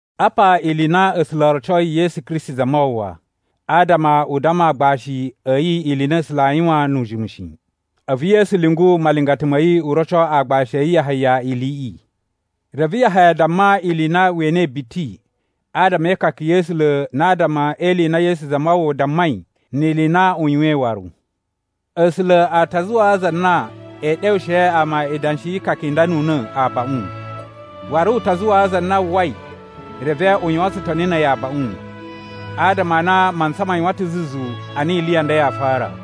Apa ili i na A̱sula̱ o rocoi Yesu Kristi Zamawawa, adama u damma agbashi a̱ yi ili i na A̱sula̱ aa yuwan nu ujimu shi. A̱vu Yesu lyungu malingata ma̱ yi u roco aagbashi a̱ yi Yahaya iliꞌi. Reve Yahaya damma ili i na we enei biti adama e ikaka ya̱ A̱sula̱ na adama e ili i na Yesu Zamawawa dammai ni ili i na u yuwain waru. A̱sula̱ a ta zuwaa za na ee ɗewushe ama idanshi yi ikaka i nda nu una̱ abaꞌun, waru u ta zuwaa za na uwwai reve u yuwan tsutoni na̱ a̱yi abaꞌun. Adama a na mantsa ma yuwan ta̱ zuzu a na ili i nda yaa fara.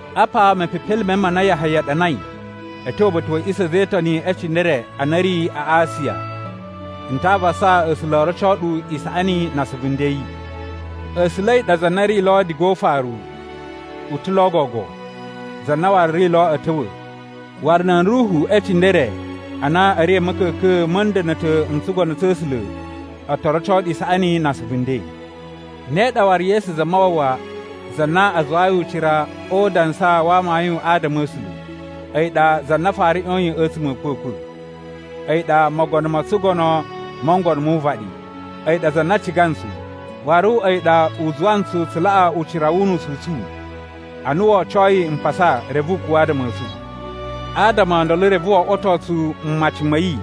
Apa mepepelime ma na Yahaya ɗanai a̱ tyo uba̱ta̱ wa̱ a̱ꞌisa̱ a̱ a̱za̱ e Itoni e cindere a na a̱ ri a Asiya. N ta avasa A̱sula̱ o roco ɗu isaꞌani na asuvu nden a̱ yi. A̱sula̱ a̱yi ɗa za na ri lo diga o ufaru, u ta̱ lo gogo, za na waru ri lo a̱ ta̱wa̱. Waru nan ruhu e cindere a na a̱ ri a̱ ma̱ka̱ka̱n ma̱ nda̱na̱ta̱ n tsugono tsa̱ A̱sula̱ o to roco ɗu isaꞌani na asuvu nden. Ne ɗa waru Yesu Zamawawa za na a zuwayi ucira o udansa wa amayun adama a̱ A̱sula̱. A̱yi ɗa za na fara ꞌyoyin a̱tsuma̱ a̱ a̱kwa̱kwa̱. A̱yi ɗa mogono mo tsugono mo ngono mu uvaɗi. A̱yi ɗa za na ciga ntsu, waru a̱yi ɗa u zuwa ntsu tsu laꞌa ucira wu unusu u tsu ana wo ocoi mpasa reve u kuwa̱ adama a̱ tsu. Adama o ndolo reve wo oꞌwoto tsu mmaci ma̱ yi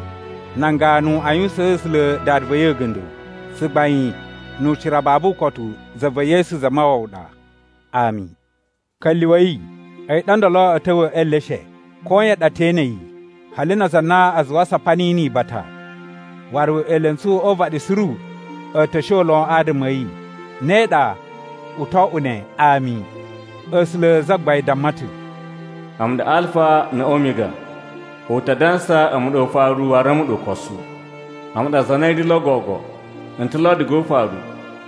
nan ganu a yuwusaan A̱sula̱ Dada va̱ yi a̱ga̱nda̱. Tsugbain nu ucira babu ukotu za va̱ Yesu Zamawawa ɗa! Ami. Ka̱lyuwa̱i, a̱yi ɗa ndolo a̱ ta̱wa̱ e eleshe! Koyan ɗa te ene yi, hali na aza a na a zuwa a sapa niyi ni ibata, waru elentsu o uvaɗi suru a̱ ta̱ shon lon adama a̱ yi. Ne ɗa, u to oꞌwo ne! Ami. A̱sula̱ Zagbain damma ta̱, “A̱mu ɗa Alfa na̱ Omiga. U ta dansa a̱mu ɗa Ufaru waru a̱mu ɗa Ukosu. A̱mu ɗa za na ri lo gogo, n ta̱ lo diga o ufaru,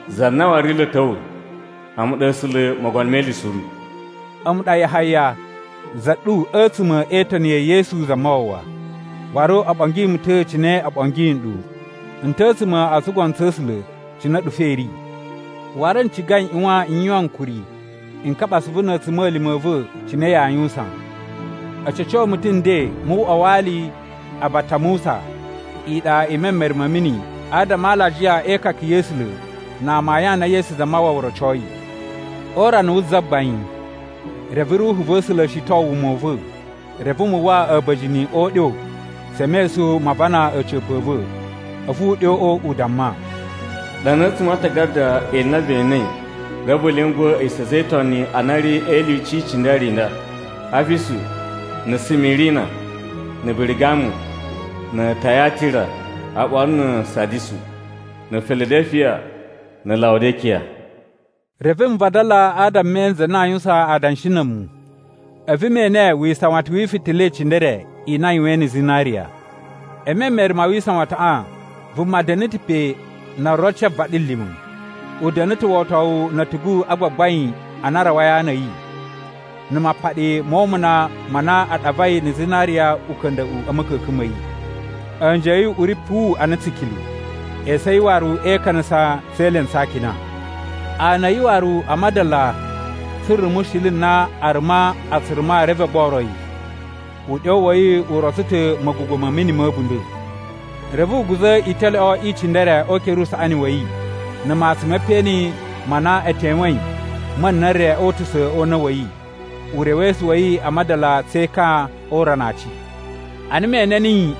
za na waru ri lo a̱ ta̱wa̱. A̱mu ɗa A̱sula̱ Mogono me Ili Suru.” A̱mu ɗa Yahaya, za ɗu a̱tsuma̱ e Itoni ya̱ Yesu Zamawawa, waru o ɓongi mu ta̱ cine o ɓongi nɗu. N ta̱ a̱tsuma̱ o tsugono tsa̱ A̱sula̱ cine a̱ɗu fo i ri. Waru n ciga n ꞌyuwan n yuwan ankuri n kaɓa asuvu na̱ a̱tsuma̱lima̱ a̱ va̱ cine yaa yuwusan. A̱ ca̱co mu ta̱ nden mu uꞌwa wa ali a Batamusa, iɗa i memere ma̱ mini, adama a alajiya e ikaka ya̱ A̱sula̱ na amayun a na Yesu Zamawawa rocoi. O urana wu Zagbain, reve Ruhu va̱ A̱sula̱ shiton wuma u va̱, reve mu uwwa a̱ba̱jini o uɗyo tse mesun ma aavana a̱ca̱pa̱ a̱ va̱. A̱vu uɗyoꞌo u damma, “Ɗana a̱tsuma̱ a aatagada ili i na ve enei reve vu lyunguwa̱ a̱ꞌisa̱ a̱ a̱za̱ e Itoni a na a̱ ri e ilyuci i cindere i nda: Afisu, na̱ Simirina, na̱ Birigamu, na̱ Tayatira, oɓolo na̱ Sadisu, na̱ Filadalifiya na̱ Lawudikiya.” Reve n vadala adama me ene za na aa yuwusan adanshi na̱ a̱mu, a̱vu me ene wisawatan wi ifitila i cindere i na a yuwain na̱ zinariya. E memere ma wisawataꞌan, vuma da̱na̱ ta̱ pe na rotsoi vaɗilima̱. U da̱na̱ ta̱ wotowu na̱ a̱tugu a gbagbain a na a rawai a ana a̱ yi, na̱ mapaɗi mo umuna ma na a ɗavai na̱ zinariya uka̱nda̱ꞌu a̱ ma̱ka̱ka̱n ma̱ yi. A̱nji a̱ yi uꞌuri puwu ana tsikilu, esu a̱ yi waru e ikanasa tse elentsu a akina. Ana a̱ yi waru a madala tsu rumushili na aruma a tsu ruma reve o gboro yi, uɗyo wa̱ yi u rotso ta̱ ma̱gugwa̱ ma̱ mini ma̱ a̱bunda̱. Reve u guza̱ italyoꞌo i cindere o ukere usaꞌani wa̱ yi, na̱ matsun me peꞌeni ma na e tewein ma̱ na̱ re o utusa̱ o una̱ wa̱ yi. Urewesu wa̱ yi a madala tse ekan o urana a aci. Ana me ene niyi,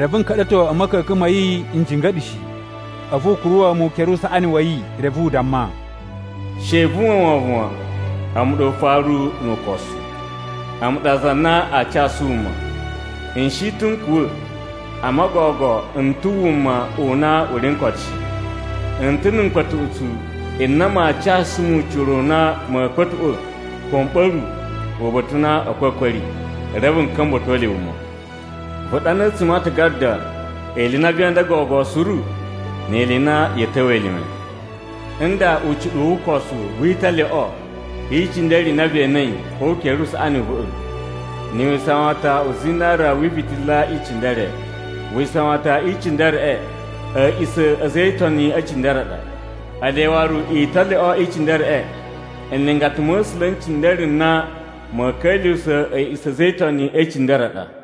reve n ka̱ɗa̱to a̱ ma̱ka̱ka̱n ma̱ yi n jinga̱ɗa̱ shi. A̱vu u kuruwa̱ mu ukere usaꞌani wa̱ yi reve u damma, “She vu uwwa wovon wan, a̱mu ɗa Ufaru nu Ukosu. A̱mu ɗa za na aa casu wuma. N shi ta̱ n kuwa̱, amma gogo n ta̱ wuma u na u ri n koto shi. N ta̱ na̱ mkpa̱tuꞌutsu n na maa casu mu ucira u na ma̱a̱ kpa̱tuꞌwa̱ ko m ɓa̱ru uba̱ta̱ u na a̱kwa̱kwa̱ a̱ ri, reve n ka̱mba̱to le wuma. “Vu ɗana a̱tsuma̱ a aatagada ili i na vee inda gogo suru ni ili i na ya̱a̱ ta̱wa̱ elime. Nda ucuɗuwu wu usokowu wi italyoꞌo i cindere i na ve enei o ukere usaꞌani u va̱ꞌa̱, na̱ wisawatan u zinariya wi ifitila i cindere: Wisawatan i cindereꞌe a̱ꞌisa̱ a̱ a̱za̱ e Itoni e cindere a ɗa, ele waru italyoꞌo i cindereꞌe nlingata ma̱ A̱sula̱ n cindere n na ma̱a̱ ka̱lyuwusa̱ a̱ꞌisa̱ a̱ a̱za̱ e Itoni e cindere a ɗa.”